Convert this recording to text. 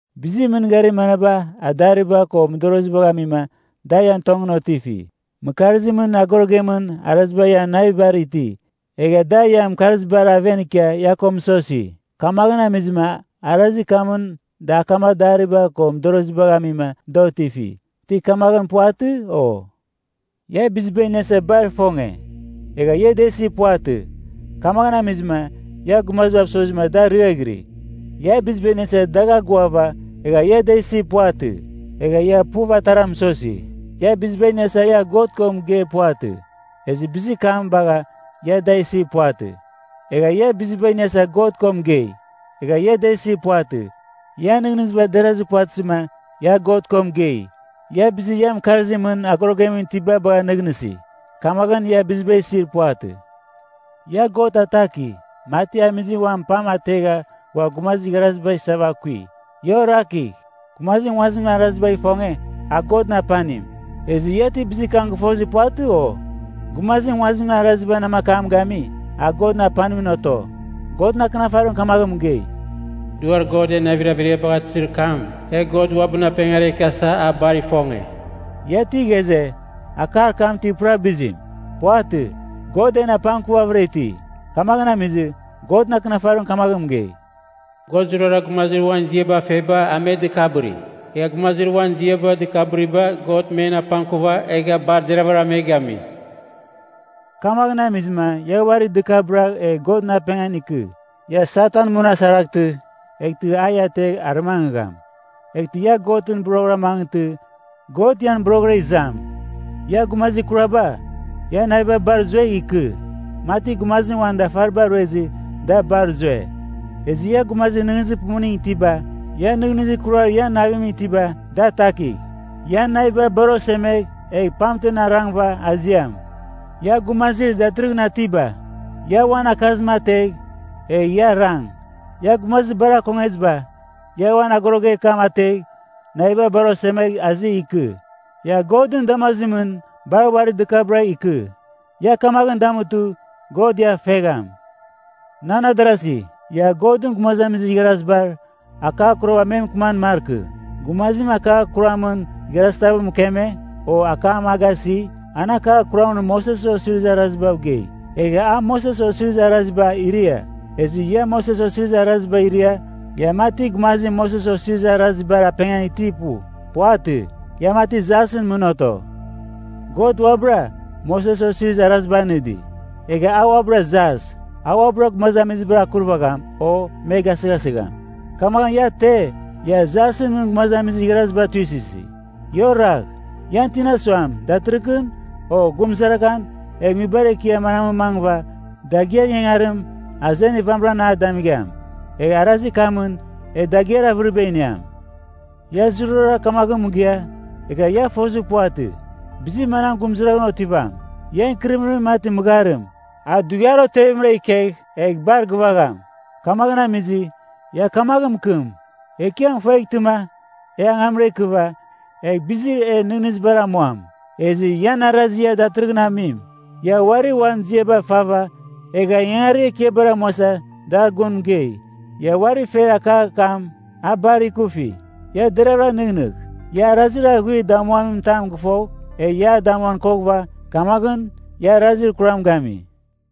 Bizir mɨngarir manaba adariba ko mɨdorozibagh amima da ian tongɨn otifi? Mɨkarzimɨn agorogemɨn araziba ian navibar iti, egha da ian mɨkarzibar aven ikia ia ko mɨsosi, kamaghɨn amizɨma arazir kamɨn da akam adariba ko mɨdorozibagh amima da otifi. Ti kamaghɨn puvatɨ, o? Ia biziba iniasa bar ifonge, egha ia da isir puvatɨ. Kamaghɨn amizɨma ia gumazibav sozima da ariaghɨri. Ia biziba iniasa dagh agoava, egha ia da isir puvatɨ. Egha ia puv atara mɨsosi. Ia biziba iniasa ia God ko mɨgeir puvatɨ, ezɨ bizir kam bagha ia da isir puvatɨ. Egha ia biziba iniasa God ko mɨgei, egha ia da isir puvatɨ. Ian nɨghnɨziba derazir puvatɨzɨma ia God ko mɨgei. Ia bizir ian mɨkarzimɨn agorogem itiba bagha nɨghnɨsi. Kamaghɨn, ia biziba isir puvatɨ. Ia God ataki, mati amizim uan pam ategha ghua gumazir igharaziba isava akui. Ia orakigh! Gumazim nguazimɨn arazibagh ifonge, a Godɨn apanim. Ezɨ ia ti bizir kam gɨfozir puvatɨ, o? Gumazim nguazimɨn arazibar namakam gami, a Godɨn apanimɨn oto. Godɨn Akɨnafarim kamaghɨn mɨgei, “Duar God en navir averiabagh atɨzir kam, e God uabɨn apengara ikiasa a bar ifonge.” Ia ti ghaze, akar kam ti pura bizim? Puvatɨ. God en apangkuvavɨra iti. Kamaghɨn amizɨ, Godɨn Akɨnafarim kamaghɨn mɨgei, “God zurara gumazir uan ziaba feba a me dɨkabɨri, egha gumazir uan ziaba dɨkabɨriba God men apangkuva egha bar deravɨra me gami.” Kamaghɨn amizɨma ia uari dɨkabɨragh egh Godɨn apengan ikɨ. Ia Satan munasaraghtɨ, eghtɨ a ia ategh arɨmangɨgham. Eghtɨ ia Godɨn boroghɨra mangɨtɨ, God ian boroghɨra izam. Ia gumazir kuraba, ian naviba bar zuegh ikɨ, mati gumazim uan dafariba ruezɨ da bar zue. Ezɨ ia gumazir nɨghnɨzir pumuning itiba, ia nɨghnɨzir kurar ian navimɨn itiba da atakigh. Ia naviba bar osemegh egh pamtem arangɨva aziam. Ia gumazir datɨrɨghɨn atiba, ia uan akazim ategh, egh ia arang. Ia gumazir bar akongeziba, ia uan agoroger kam ategh, naviba bar osemegh azi ikɨ. Ia Godɨn damazimɨn bar uari dɨkabɨragh ikɨ. Ia kamaghɨn damutɨ, God ia fegham. Nan adarasi, ia Godɨn gumazamizir igharaziba akar kurabar me mɨkɨman markɨ. Gumazim akar kuramɨn igharazitav mɨkeme, o akam a gasi, an akar kuramɨn Moses Osirizir Arazibav gei, egha a Moses Osirizir Araziba iria. Ezɨ ia Moses Osirizir Araziba iria, ia mati gumazim Moses Osirizir Arazibar apengan itir pu. Puvatɨ. Ia mati jasɨn mɨn oto. God uabɨra Moses Osirizir Araziba anɨdi, egha a uabɨra jas. A uabɨra gumazamizibar akurvagham, o me gasɨghasɨgham. Kamaghɨn ia te, ia jasɨn mɨn gumazamizir igharaziba tuisɨsi? Ia oragh, ian tina suam, “Datɨrɨghɨn, o gurumzaraghan e nguibar ekiar mamɨn mangɨghɨva dagɨar ingangarim azenir vamɨran a damigham. Egh arazir kamɨn e dagɨar avɨriba iniam.” Ia zurara kamaghɨn mɨgɨa, egha ia fozir puvatɨ, bizir manam gurumzaraghan otivam. Ian ikɨrɨmɨrim mati mɨgharim, a dughiar otevimra ikegh egh bar gɨvagham. Kamaghɨn amizɨ, ia kamaghɨn mɨkɨm, “Ekiam ifueghtɨma, e angamra ikɨva, egh bizir e nɨghnɨzibar amuam.” Ezɨ ian arazir ia datɨrɨghɨn amim, ia uari uan ziaba fava egha ingangarir ekiabar amuasa dar gun mɨgei. Ia uari fer akar kam, a bar ikufi. Ia deravɨra nɨghnɨgh! Ia arazir aghuir damuamin tam gɨfogh, egh ia a damuan koghɨva, kamaghɨn ia arazir kuram gami.